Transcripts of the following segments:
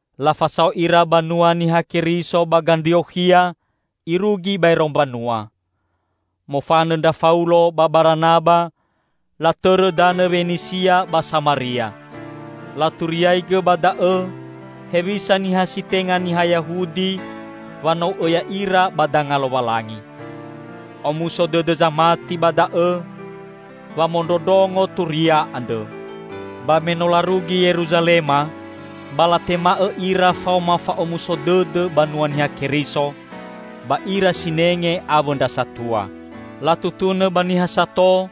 Lafasao ira banua Niha Keriso ba Gandriokhia irugi baero mbanua. Mofanõ ndra Faulo ba Baranaba latõrõ danõ Wenisia ba Samaria. Laturiaigõ ba da'õ hewisa niha si tenga niha Yahudi wanou'õ ya'ira ba danga Lowalangi. Omuso dõdõ zamati ba da'õ wamondrondrongo Turia andrõ. Ba me no larugi Yeruzalema, ba latema'õ ira faoma fa'omuso dõdõ banua Niha Keriso, ba ira sinenge awõ ndra satua. Latutunõ ba niha sato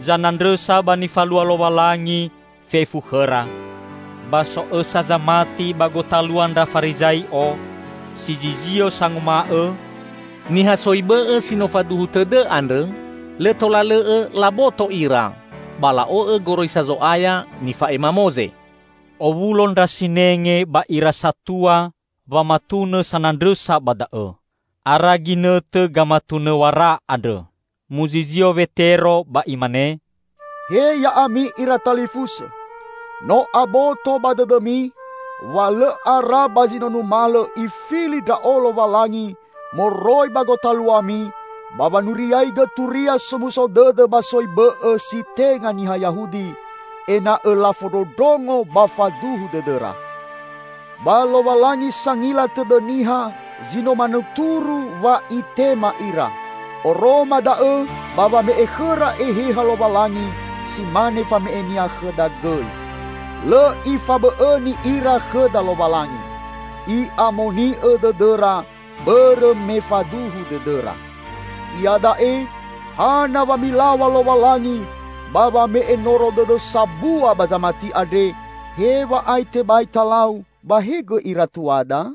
zanandrõsa ba nifalua Lowalangi fefu khõra. Ba so õsa zamati ba gotalua ndra Farizai'o, si zizio sanguma'õ, "Niha soi bõ'õ si no faduhu tõdõ andrõ lõ tola lõ'õ laboto ira ba la'o'õ goroisa Zo'aya nifa'ema Moze." Owulo ndra sinenge ba ira satua wamatunõ sanandrõsa ba da'õ. Ara ginõtõ gamatunõw̃ara andrõ. Muzizio Wetero ba imane, "He ya'ami ira talifusõ! No aboto ba dõdõmi wa lõ ara ba zi no numalõ Ifili ndra'o Lowalangi moroi ba gotaluami ba wanuriaigõ Turia Somuso Dõdõ ba soi bõ'õ si tenga niha Yahudi, ena'õ lafondrondrongo ba faduhu dõdõra. Ba Lowalangi sangila tõdõ niha zi no manuturu wa Itema ira; oroma da'õ ba wame'e khõra Eheha Lowalangi si mane fame'e-Nia khõda gõi. Lõ Ifabõ'õni ira khõda Lowalangi. I'amoni'õ dõdõra bõrõ me faduhu dõdõra. Iada'e, hana wa milaw̃a Lowalangi ba wame'e noro dõdõ sabua ba zamati andre, hew̃a'ae tebai talau ba he gõi ira tuada?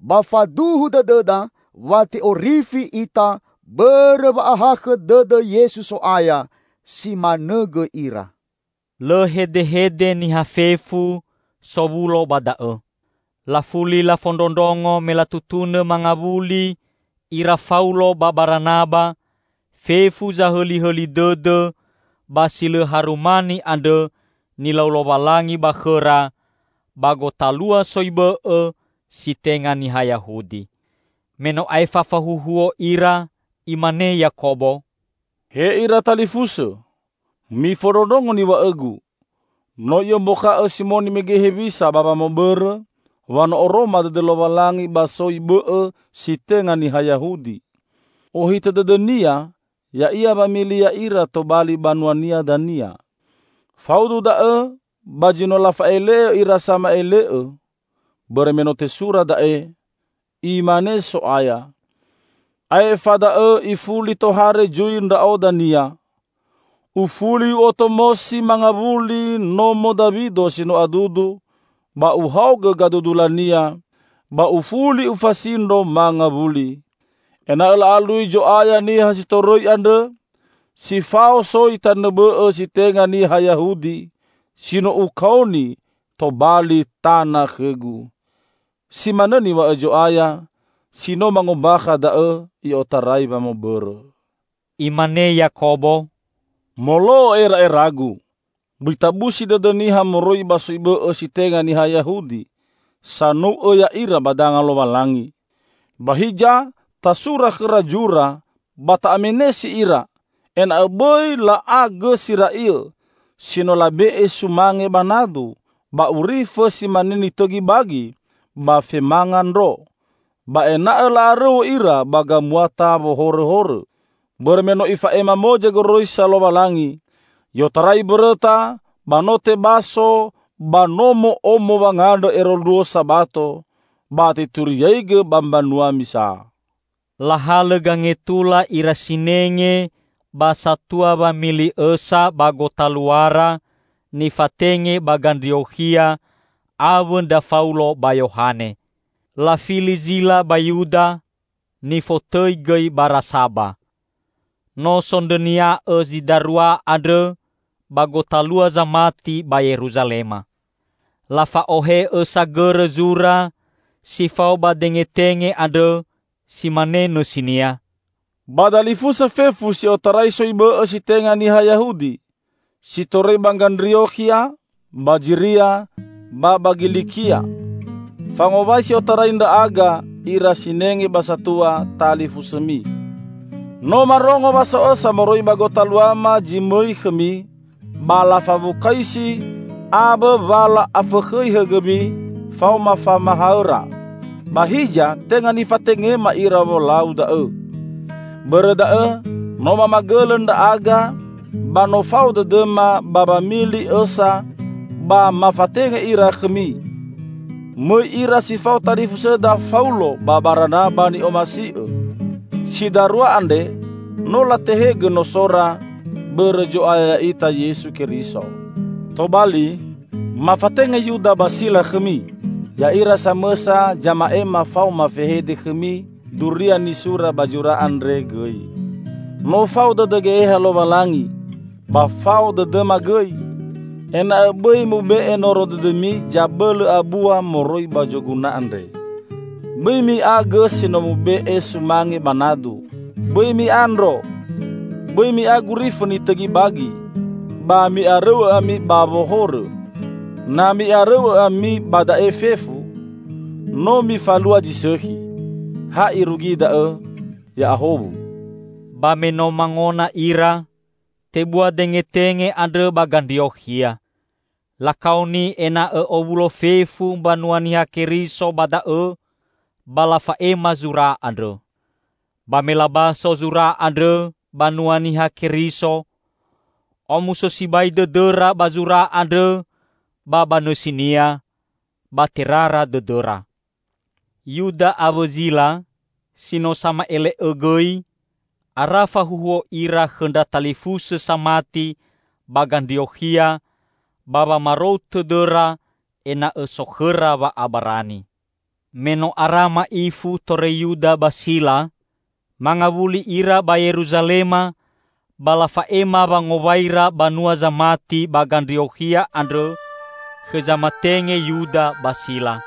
Ba faduhu dõdõda wa te'orifi ita bõrõ wa'ahakhõ dõdõ Yesu So'aya; si manõ gõi ira." Lõ hedehede niha fefu sowulo ba da'õ. Lafuli lafondrondrongo me latutunõ mangawuli ira Faulo ba Baranaba fefu zahõlihõli dõdõ ba si lõ harumani andrõ nilau Lowalangi ba khõra ba gotalua soi bõ'õ si tenga niha Yahudi. Me no aefa fahuhuo ira, imane Yakobo, "He ira talifusõ! Mifondrondrongo niw̃a'õgu. No i'ombakha'õ Simoni mege hewisa ba wamõbõrõ wa no oroma dõdõ Lowalangi ba soi bõ'õ si tenga niha Yahudi. Ohitõ dõdõ-Nia ya'ia wamili ya'ira tobali banua-Nia dania. Faudu da'õ ba zi no lafa'ele'õ ira sama'ele'õ. Bõrõ me no tesura da'e, Imane So'aya, 'Aefa da'õ ifuli tohare zui Ndra'o dania,' 'Ufuli U'otomosi mangawuli nomo Dawido si no adudu, ba Uhaogõ gadudulania, ba Ufuli Ufasindro mangawuli; ena'õ la'alui Zo'aya niha si torõi andrõ, si fao soi tanõ bõ'õ si tenga niha Yahudi si no Ukaoni tobali tana khõ-Gu.' Si manõ niw̃a'õ Zo'aya, si no mangombakha da'õ i'otarai wamõbõrõ." Imane Yakobo, "Molo'õ era'eragu, bõi tabusi dõdõ niha moroi ba soi bõ'õ si tenga niha Yahudi sanou'õ ya'ira ba danga Lowalangi. Ba hiza tasura khõra zura ba ta'amenesi ira ena'õ bõi la'a gõ si ra'iõ si no labe'e sumange ba nadu, ba urifõ si mane nitõgi bagi, ba femanga ndro. Ba ena'õ la'arõu'õ ira ba gamuata wohorõhorõ. Bõrõ me no ifa'ema Moze goroisa Lowalangi, i'otarai mbõrõta ba no tebaso ba nomo'omo wangandrõ ero luo Sabato, ba teturiaigõ ba mbanua misa." Lahalõ gangetula ira sinenge ba satua wamili õsa ba gotaluara nifatenge ba Gandriokhia awõ ndra Faulo ba Yohane. Lafili Zila ba Yuda, nifotõi gõi Barasaba. No sondrõnia'õ zi darua andrõ ba gotalua zamati ba Yeruzalema. Lafa'ohe'õ sagõrõ zura si fao ba dengetenge andrõ, si mane nõsinia, "Ba dalifusõ fefu si otarai soi bõ'õ si tenga niha Yahudi, si torõi ba Gandriokhia, ba Ziria ba ba Gilikia. Fangowai si otarai ndra'aga, ira sinenge ba satua, talifusõmi. No marongo wa so õsa moroi ba gotaluama zi mõi khõmi ba lafawukaisi awõ wa la'afõkhõi hõgõmi faoma famahaõra. Ba hiza tenga nifatengema ira wolau da'õ. Bõrõ da'õ no mamagõlõ ndra'aga ba no fao dõdõma ba wamili õsa ba mafatenge ira khõmi. Mõi ira si fao talifusõda Faulo ba Baranaba ni'omasi'õ. Si darua andre no latehegõ nosora bõrõ Zo'aya ya'ita Yesu Keriso. Tobali, mafatenge Yuda ba Sila khõmi. Ya'ira samõsa zama'ema faoma fehede khõmi duria nisura ba zura andre gõi. No fao dõdõ Geheha Lowalangi -- ba fao dõdõma gõi -- ena'õ bõi mube'e noro dõdõmi zabõlõ abua moroi ba zoguna andre: Bõi mi'a gõ si no mube'e sumange ba nadu; bõi mi'a ndro, bõi mi'a gurifõ nitõgi bagi, ba mi'arõu'õ ami ba wohorõ. Na mi'arõu'õ ami ba da'e fefu, no mifalua zi sõkhi. Ha irugi da'õ, Ya'ahowu!" Ba me no mangona ira, tebua dengetenge andrõ ba Gandriokhia. Lakaoni ena'õ owulo fefu mbanua Niha Keriso ba da'õ ba lafa'ema zura andrõ. Ba me labaso zura andrõ banua Niha Keriso, omuso sibai dõdõra ba zura andrõ ba ba nõsinia, ba terara dõdõra. Yuda awõ Zila, si no sama'ele'õ gõi, ara fahuhuo ira khõ ndra talifusõ samati ba Gandriokhia ba wamarou tõdõra ena'õ so khõra wa'abarani. Me no ara ma'ifu torõi Yuda ba Sila, mangawuli ira ba Yeruzalema ba lafa'ema wangowaira banua zamati ba Gandriokhia andrõ khõ zamatenge Yuda ba Sila.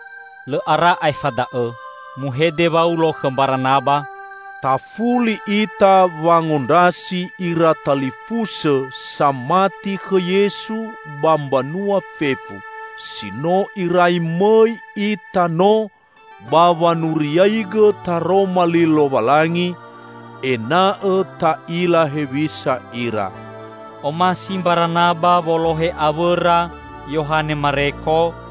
Lõ ara aefa da'õ muhede Waulo khõ Mbaranaba, "Tafuli ita wangondrasi ira talifusõ samati khõ Yesu ba mbanua fefu, si no irai mõi ita no ba wanuriaigõ Taroma Li Lowalangi; ena'õ ta'ila hewisa ira." Omasi Mbaranaba wolohe awõra Yohane Mareko,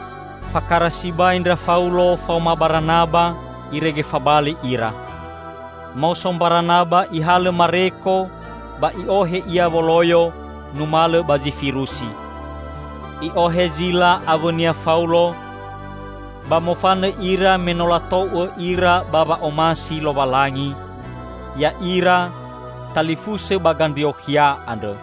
Fakara sibai ndra Faulo faoma Baranaba irege fabali ira. Maoso Mbaranaba ihalõ Mareko ba i'ohe ia woloyo numalõ ba Zifirusi. I'ohe Zila awõnia Faulo ba mofanõ ira me no latou'õ ira ba wa'omasi Lowalangi, ya'ira, talifusõ ba Gandriokhia andrõ.